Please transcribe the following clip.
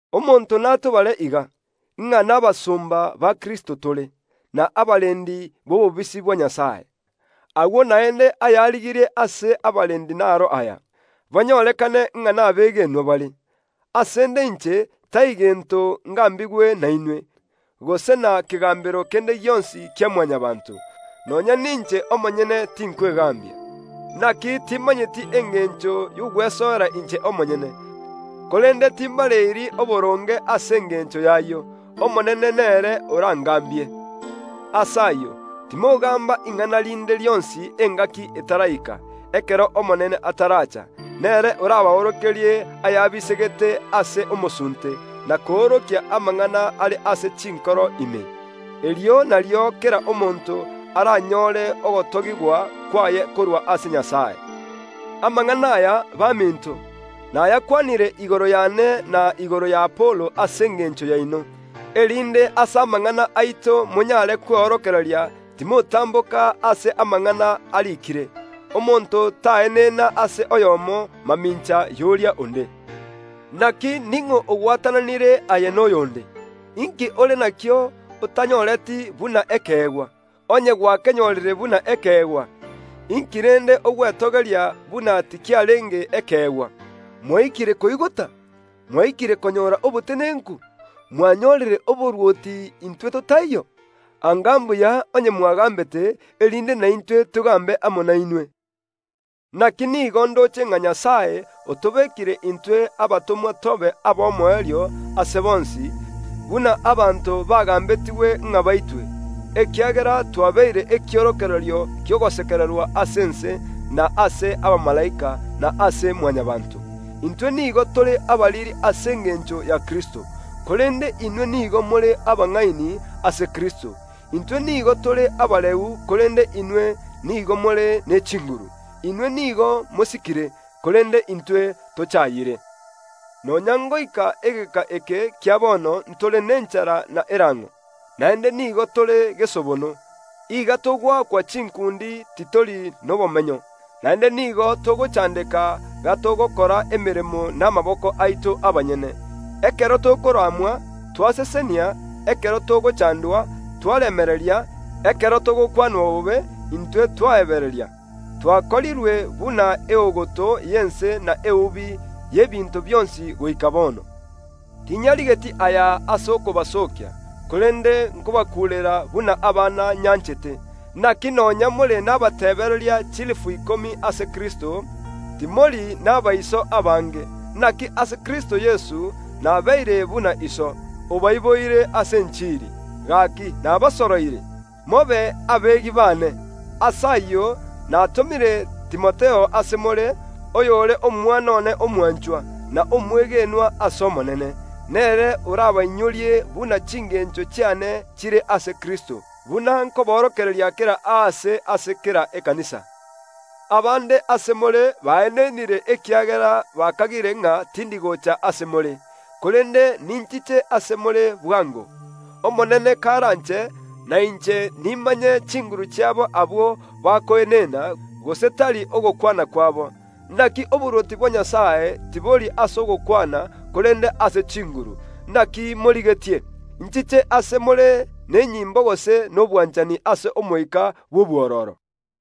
Omonto natobare iga, ng’a nabasomba ba Kristo tore, na abarendi b’obobisi bwa Nyasae. Agwo naende ayarigirie ase abarendi naro aya: banyorekane ng’a nabegenwa bare. Asende inche, tai gento ngambigwe nainwe, gose na kegambero kende gionsi kia Mwanyabaanto. Nonya ninche omonyene tinkwegambia. Naki timanyeti engencho y’ogwesoera inche omonyene, korende timbareiri oboronge ase engencho y’ayio. Omonene nere orangambie. Ase ayio timogamba ing’ana rinde rionsi engaki etaraika, ekero Omonene ataracha; nere orabaorokerie ayabisegete ase omosunte, na koorokia amang’ana are ase chinkoro ime. Erio nario kera omonto aranyore ogotogigwa kwaye korwa ase Nyasae. Amang’ana aya, baminto, nayakwanire igoro yane na igoro y’Apolo ase engencho yaino, erinde ase amang’ana aito monyare kweorokereria timotamboka ase amang’ana ariikire. Omonto taenena ase oyomo mamincha y’oria onde. Naki ning’o ogwatananire aye noyonde? Inki ore nakio otanyoreti buna ekeegwa? Onye gwakenyorire buna ekeegwa, inki rende ogwetogeria buna tikiarenge ekeegwa? Mwaikire koigota! Mwaikire konyora obotenenku! Mwanyorire oborwoti intwe totaiyo! Anga mbuya onye mwagambete, erinde naintwe togambe amo nainwe! Naki nigo ndoche ng’a Nyasae otobekire intwe abatomwa tobe ab’omoerio ase bonsi, buna abanto bagambetigwe ng’a baitwe, ekiagera twabeire ekiorokererio ki’ogosekererwa ase ense, na ase abamalaika, na ase Mwanyabaanto. Intwe nigo tore abariri ase engencho ya Kristo, korende inwe nigo more abang’aini ase Kristo. Intwe nigo tore abareu, korende inwe nigo more ne chinguru. Inwe nigo mosikire, korende intwe tochayire. Nonya ngoika egeka eke kia bono ntore nenchara na erang’o, naende nigo tore gesobono; iga togoakwa chinkundi titori nobomenyo, naende nigo togochandeka gatogokora emeremo namaboko aito abanyene. Ekero tokoramwa, twasesenia; ekero togochandwa, twaremereria; ekero togokwanwa bobe, intwe twaebereria. Twakorirwe buna eogoto y’ense na eubi y’ebinto bionsi goika bono. Tinyarigeti aya ase okobasookia, korende nkobakuurera buna abana nyanchete. Naki nonya more nabateebereria chilifu ikomi ase Kristo, timori nabaiso abange. Naki ase Kristo Yeso nabeire buna iso, obaiboire ase enchiri. Gaki nabasoroire, mobe abegi baane. Ase ayio natomire Timotheo ase more, oyore omwana one omwanchwa, na omwegenwa ase Omonene. Nere orabainyorie buna chingencho chiane chire ase Kristo, buna nkoborokereria kera aase ase kera ekanisa, Abande ase more baenenire ekiagera bakagire ng’a tindi gocha ase more. Korende ninchiche ase more bwango, Omonene karanche, na inche nimanye chinguru chiabo abwo bakoenena, gose tari ogokwana kwabo. Naki oborwoti bwa Nyasae tibori ase ogokwana, korende ase chinguru. Naki morigetie? Inchiche ase more nenyimbo gose nobwanchani ase omoika bw’obwororo?